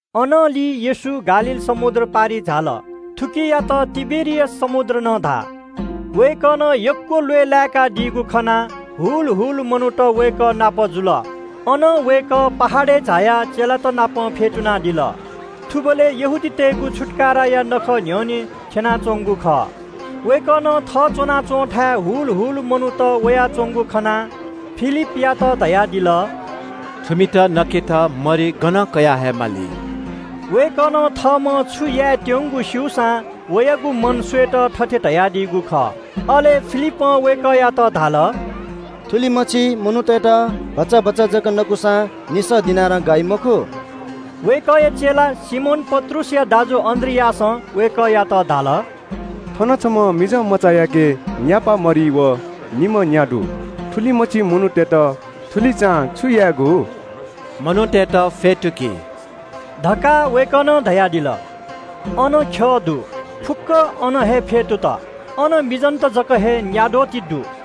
अनंलि येशू गालील समुद्र पारिइ झाल। थुकियात तिबेरियास समुद्र नं धाः। वय्‌कलं यक्‍व ल्‍वय् लाय्‌कादीगु खनाः ग्‍वाः ग्‍वाः मनूत वय्‌कःया ल्‍यूल्‍यू जुल। अनं वय्‌कः पहाडय् झायाः चेलात नाप फ्‍यतुनादिल। थुबलय् यहूदीतय्‌गु छुत्‍काराया नखः न्‍ह्यःने थ्‍यनाच्‍वंगु खः। वय्‌कलं थः च्‍वनाच्‍वंथाय् हुल हुल मनूत वयाच्‍वंगु खनाः फिलिपयात धयादिल – “थुमित नकेत मरि गनं कयाहयेमाली?” वय्‌कलं थःम्‍हं छु यायेत्‍यंगु स्‍यूसां वयागु मन स्‍वयेत थथे धयादीगु खः। अले फिलिपं वय्‌कःयात धाल – “थुलिमछि मनूतय्‌त भचा भचा जक नकूसां निसः दिनारया मरि नं गाइ मखु।” वय्‌कःया चेला सिमोन पत्रुसया दाजु अन्‍द्रियासं वय्‌कःयात धाल – “थन छम्‍ह मिजंमचायाके तछ्वया न्‍यापा मरि व निम्‍ह न्‍या दु। थुलिमछि मनूतय्‌त थुलिचां छु यायेगु?” “मनूतय्‌त फ्‍यतुकि” धकाः वय्‌कलं धयादिल, अन यक्‍व घाँय् दुगु ख्‍यः दु। फुक्‍कं अन हे फ्‍यतुत। अन मिजंत जक हे न्‍याद्वः ति दु।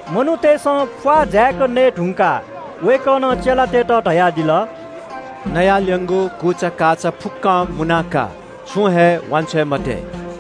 मनूतय्‌सं प्‍वाः जाय्‌क नये धुंकाः वय्‌कलं चेलातय्‌त धयादिल – “इनाः ल्‍यं दुगु मरि छुं हे सितिं छ्वये मते।”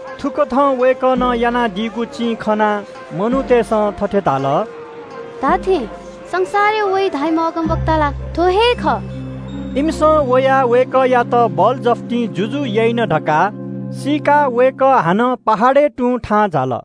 थुकथं वय्‌कलं यानादीगु चिं खनाः मनूतय्‌सं थथे धाल – “धात्‍थें, संसारय् वइ धाःम्‍ह अगमवक्ता ला थ्‍व हे खः।” इमिसं वयाः थःत ज्‍वनाः बलजफ्तिं जुजु याइन धकाः सीकाः येशू हानं याकःचा पहाडय् तुं थाहां झाल।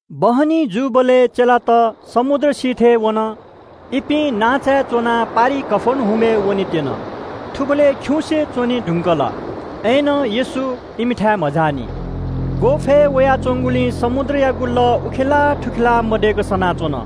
बहनी जूबलय् चेलात समुद्र सिथय् वन। इपिं नांचाय् च्‍वनाः पारिइ कफर्नहुमय् वनेत्‍यन। थुबलय् खिउँसे च्‍वने धुंकल। अय्‌नं येशू इमिथाय् मझाःनि। ग्‍वःफय् वयाच्‍वंगुलिं समुद्रयागु लः उखेलाः थुखेलाः मदय्‌क सनाच्‍वन।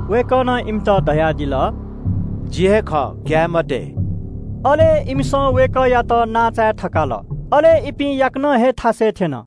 वय्‌कलं इमित धयादिल – “जि हे खः, ग्‍याये मते।” अले इमिसं लय्‌तायाः वय्‌कःयात नांचाय् थकाल। अले इपिं याकनं हे थ्‍यनेमाःगु थासय् थ्‍यन।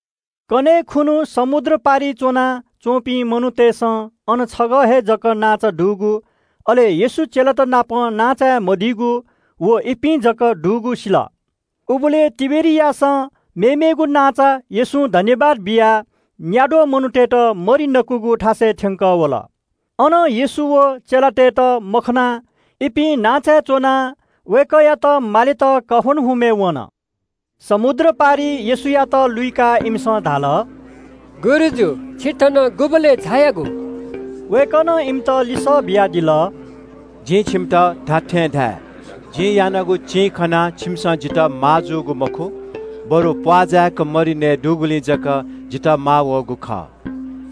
कन्‍हय् खुन्‍हु समुद्र पारिइ च्‍वनाच्‍वंपिं मनूतय्‌सं अन छगः हे जक नांचा दुगु, अले येशू चेलात नाप नांचाय् च्‍वना मदीगु, व चेलात जक वंगु खँ सिल। उबलय् तिबेरियासं मेमेगु नांचा येशूं सुभाय् बियाः न्‍याद्वः मनूतय्‌त मरि नकूगु थासय् थ्‍यंकः वल। अन येशू व चेलातय्‌त मखनाः इपिं नांचाय् च्‍वनाः वय्‌कःयात मामां कफर्नहुमय् वन। समुद्र पारिइ येशूयात लुइकाः इमिसं धाल – “गुरुजु, छि थन गुबलय् झायागु?” वय्‌कलं इमित लिसः बियादिल – “जिं छिमित खःगु खँ धाये – जिं यानागु चिं खनाः छिमिसं जितः माःजूगु मखु, बरु प्‍वाः जाय्‌क मरि नयेदुगुलिं जक जितः माःजूगु खः।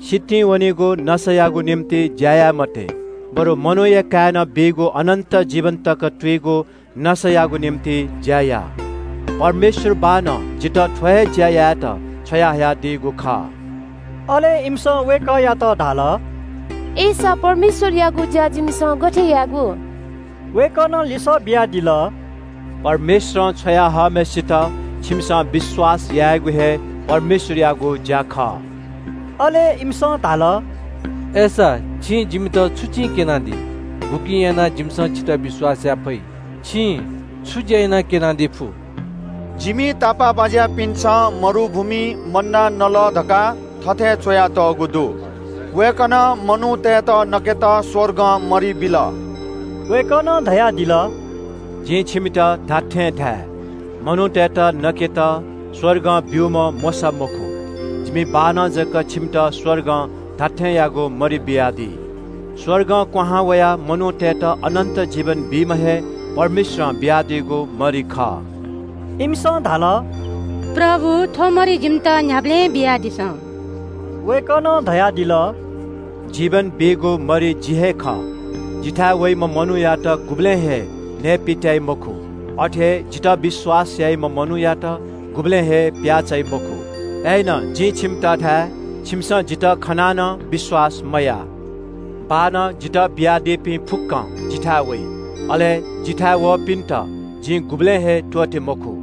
सितिं वनीगु नसायागु निंतिं ज्‍या याये मते, बरु मनूया काय्‌नं बीगु अनन्‍त जीवन तक दयाच्‍वनीगु नसायागु निंतिं ज्‍या या। परमेश्‍वर बाःनं जितः थ्‍व हे ज्‍या यायेत छ्वयाहयादीगु खः।” अले इमिसं वय्‌कःयात धाल – “अय्‌सा परमेश्‍वरयागु ज्‍या यायेत जिमिसं छु यायेगु?” वय्‌कलं लिसः बियादिल – “परमेश्‍वरं छ्वया हःम्‍हय्‌सित छिकपिन्‍सं विश्‍वास यायेगु हे परमेश्‍वरयागु ज्‍या खः।” अले इमिसं धाल – “अय्‌सा छिं जिमित छु चिं क्‍यनादी? गुकिं यानाः जिमिसं छितः विश्‍वास याये फइ? छिं छु ज्‍या यानाः क्‍यनादी फु? जिमि तापाःबाज्‍यापिन्‍सं मरुभूमिइ मन्‍ना नल धकाः थथे च्‍वयातःगु दु – ‘वय्‌कलं मनूतय्‌त नकेत स्‍वर्गं मरि बियादिल।’” वय्‌कलं धयादिल – “जिं छिमित खःगु खँ धाये – मनूतय्‌त नकेत स्‍वर्गं मरि ब्‍यूम्‍ह मोशा मखु। जिमि बाःनं जक छिमित स्‍वर्गं धात्‍थेंयागु मरि बियादी। स्‍वर्गं क्‍वहां वयाः मनूतय्‌त अनन्‍त जीवन बीम्‍ह हे परमेश्‍वरं बियादीगु मरि खः।” इमिसं धाल – “प्रभु, थ्‍व मरि जिमित न्‍ह्याबलें बियादिसँ।” वय्‌कलं धयादिल – “जीवन बीगु मरि जि हे खः। जिथाय् वइम्‍ह मनूयात गुबलें हे नयेपित्‍याइ मखु। अथे हे जितः विश्‍वास याइम्‍ह मनूयात गुबलें हे प्‍याः चाइ मखु। अय्‌नं जिं छिमित धाये – छिमिसं जितः खनाः नं विश्‍वास मयाः। बाःनं जितः बियादीपिं फुक्‍कं जिथाय् वइ। अले जिथाय् वःपिन्‍त जिं गुबलें हे त्‍वःते मखु।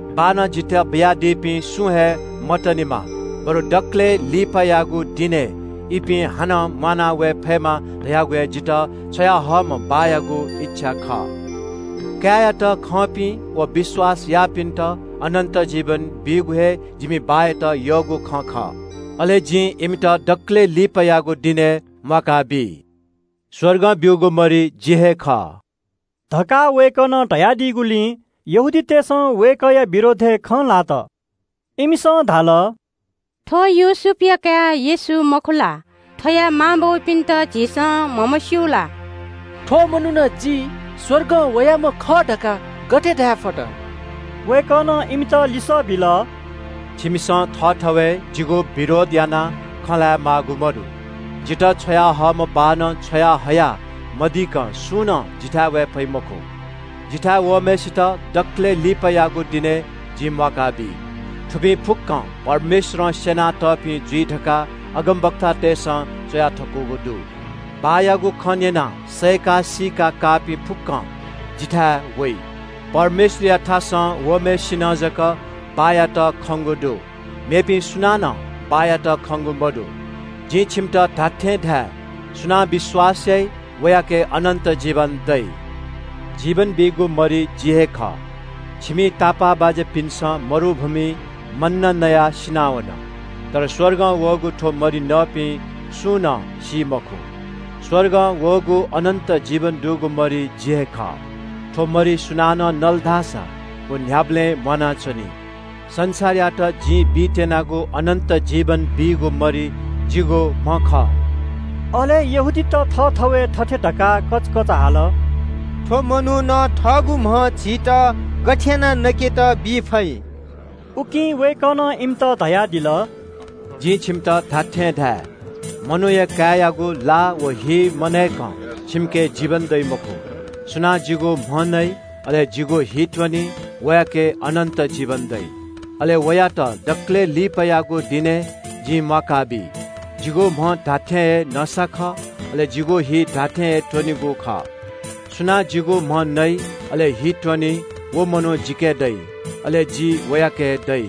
बाःनं जितः बियादीपिं सुं हे मतनेमा बरु दकलय् लिपायागु दिनय् इपिं हानं म्‍वाना वये फयेमा धयागु हे जितः छ्वयाहयादीम्‍ह बाःयागु इच्‍छा खः। काय्‌यात खंपिं व विश्‍वास याःपिन्‍त अनन्‍त जीवन बीगु हे जिमि बाःयात यःगु खँ खः। अले जिं इमित दकलय् लिपायागु दिनय् म्‍वाका बी।” “स्‍वर्गं ब्‍यूगु मरि जि हे खः” धकाः वय्‌कलं धयादीगुलिं व खँ न्‍यंपिन्‍सं वय्‌कःया विरोधय् खँ ल्‍हात। इमिसं धाल – “थ्‍व योसेफया काय् येशू मखु ला? थ्‍वया मांबौपिन्‍त झीसं म्‍हमस्‍यू ला? थ्‍व मनुखं ‘जि स्‍वर्गं वयाम्‍ह खः’ धकाः गथे धायेफत?” वय्‌कलं इमित लिसः बिल – “छिमिसं थःथवय् जिगु विरोध यानाः खँ ल्‍हाये माःगु मदु। जितः छ्वयाहयादीम्‍ह बाःनं छ्वयाहया मदीकं सुं नं जिथाय् वये फइ मखु। जिथाय् वःम्‍हय्‌सित दकलय् लिपायागु दिनय् जिं म्‍वाका बी। थुपिं फुक्‍कं परमेश्‍वरं स्‍यना तःपिं जुइ धकाः अगमवक्तातय्‌सं च्‍वया थकूगु दु। बाःयागु खँ न्‍यनाः सय्‌का सीका काःपिं फुक्‍कं जिथाय् वइ। परमेश्‍वरयाथासं वःम्‍हय्‌सिनं जक बाःयात खंगु दु, मेपिं सुनानं बाःयात खंगु मदु। “जिं छिमित खःगु खँ धाये, सुनां विश्‍वास याइ, वयाके अनन्‍त जीवन दइ। जीवन बीगु मरि जि हे खः। छिमि तापाःबाज्‍यापिन्‍सं मरुभूमिइ मन्‍ना नसां सिनावन। तर स्‍वर्गं क्‍वहां वःगु थ्‍व मरि नःपिं सुं नं सी मखु। स्‍वर्गं वःगु अनन्‍त जीवन दुगु मरि जि हे खः। थ्‍व मरि सुनानं नल धाःसा व न्‍ह्याबलें म्‍वानाच्‍वनी। संसारयात जिं बीत्‍यनागु अनन्‍त जीवन बीगु मरि जिगु म्‍ह खः।” अले यहूदीतय् नायः थःथवय् थथे धकाः कचकच हाल – “थ्‍व मनुखं थःगु म्‍ह झीत गथे यानाः नकेत बी फइ?” उकिं वय्‌कलं इमित धयादिल – “जिं छिमित खःगु खँ धाये – मनूया काय्‌यागु ला व हि मनय्‌कं छिमिके जीवन दइ मखु। सुनां जिगु म्‍ह नइ, अले जिगु हि त्‍वनी, वयाके अनन्‍त जीवन दइ। अले वयात दकलय् लिपायागु दिनय् जिं म्‍वाका बी। जिगु म्‍ह धात्‍थें हे नसा खः, अले जिगु हि धात्‍थें हे त्‍वनेगु खः। सुनां जिगु म्‍ह नइ अले हि त्‍वनी, व मनू जिके दइ, अले जि वयाके दइ।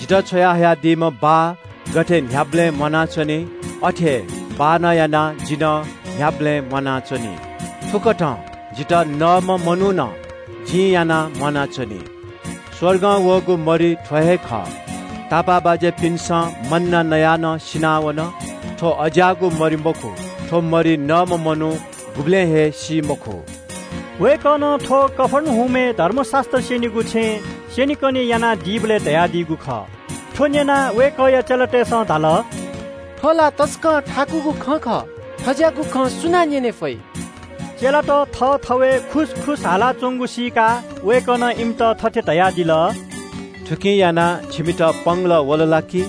जितः छ्वयाहयादीम्‍ह बाः गथे न्‍ह्याबलें म्‍वानाच्‍वनी, अथे हे बाःनं यानाः जि नं न्‍ह्याबलें म्‍वानाच्‍वनी। थुकथं जितः नःम्‍ह मनू नं जिं यानाः म्‍वानाच्‍वनी। स्‍वर्गं वःगु मरि थ्‍व हे खः। छिमि तापाःबाज्‍यापिन्‍सं मन्‍ना नयाः नं सिनावन, थ्‍व अज्‍याःगु मरि मखु, थ्‍व मरि नःम्‍ह मनू गुबलें हे सी मखु।” वय्‌कलं थ्‍व कफर्नहुमय् धर्मशास्‍त्र स्‍यनीगु छेँय् स्‍यनेकने यानादीबलय् धयादीगु खः। थ्‍व न्‍यनाः वय्‌कःया चेलातय्‌सं धाल – “थ्‍व ला तसकं थाकुगु खँ खः, थज्‍याःगु खँ सुनां न्‍यने फइ?” चेलात थःथवय् खुसखुस हालाच्‍वंगु सीकाः वय्‌कलं इमित थथे धयादिल – “थुकिं यानाः छिमित पंगलः वल ला कि?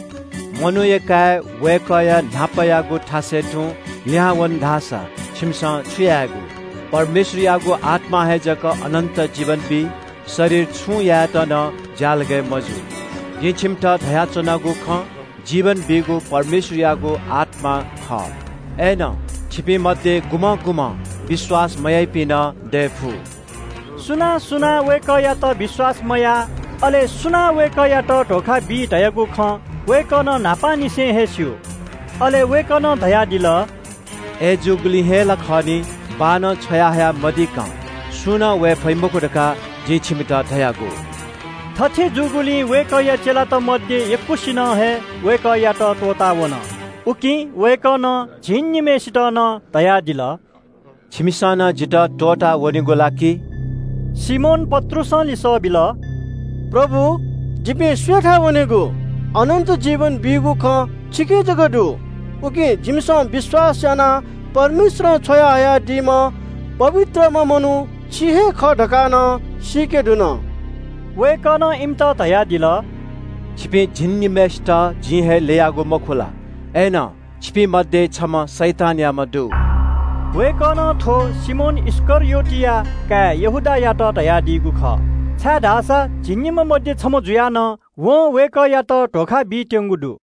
मनूया काय् वय्‌कःया न्‍हापायागु थासय् तुं लिहां वंगु खन धाःसा छिमिसं छु यायेगु? परमेश्‍वरयागु आत्‍मां हे जक अनन्‍त जीवन बी। शरीर छुं यायेत नं ज्‍यालगय् मजू। जिं छिमित धयाच्‍वनागु खँ जीवन बीगु परमेश्‍वरयागु आत्‍मा खः। अय्‌नं छिपिं मध्‍ये गुम्‍हं गुम्‍हं विश्‍वास मयाइपिं नं दये फु।” सुनां सुनां वय्‌कःयात विश्‍वास मयाः, अले सुनां वय्‌कःयात धोखा बी धयागु खँ वय्‌कलं न्‍हापांनिसें हे स्‍यू। अले वय्‌कलं धयादिल – “अय्‌जूगुलिं हे ला खः नि, बाःनं छ्वयाहया मदीकं सुं नं वये फइ मखु धकाः जिं छिमित धयागु।” थथे जूगुलिं वय्‌कःया चेलात मध्‍ये यक्‍वसिनं हे वय्‌कःयात त्‍वःताः वन। उकिं वय्‌कलं झिंनिम्‍हय्‌सित नं न्‍यनादिल – “छिमिसं नं जितः त्‍वःताः वनेगु ला कि?” सिमोन पत्रुसं लिसः बिल – “प्रभु, जिपिं सुयाथाय् वनेगु? अनन्‍त जीवन बीगु खँ छिके जक दु। उकिं जिमिसं विश्‍वास यानाः परमेश्‍वरं छ्वयाहयादीम्‍ह पवित्रम्‍ह मनू छि हे खः धकाः नं सीके धुन।” वय्‌कलं इमित धयादिल – “छिपिं झिंनिम्‍हय्‌सितं जिं हे ल्‍ययागु, मखु ला? अय्‌नं छिपिं मध्‍ये छम्‍ह शैतानयाम्‍ह दु।” वय्‌कलं थ्‍व सिमोन इस्‍करियोतया काय् यहूदायात धयादीगु खः, छाय्‌धाःसा झिंनिम्‍ह मध्‍ये छम्‍ह जुयाः नं वं वय्‌कःयात धोखा बीत्‍यंगु दु।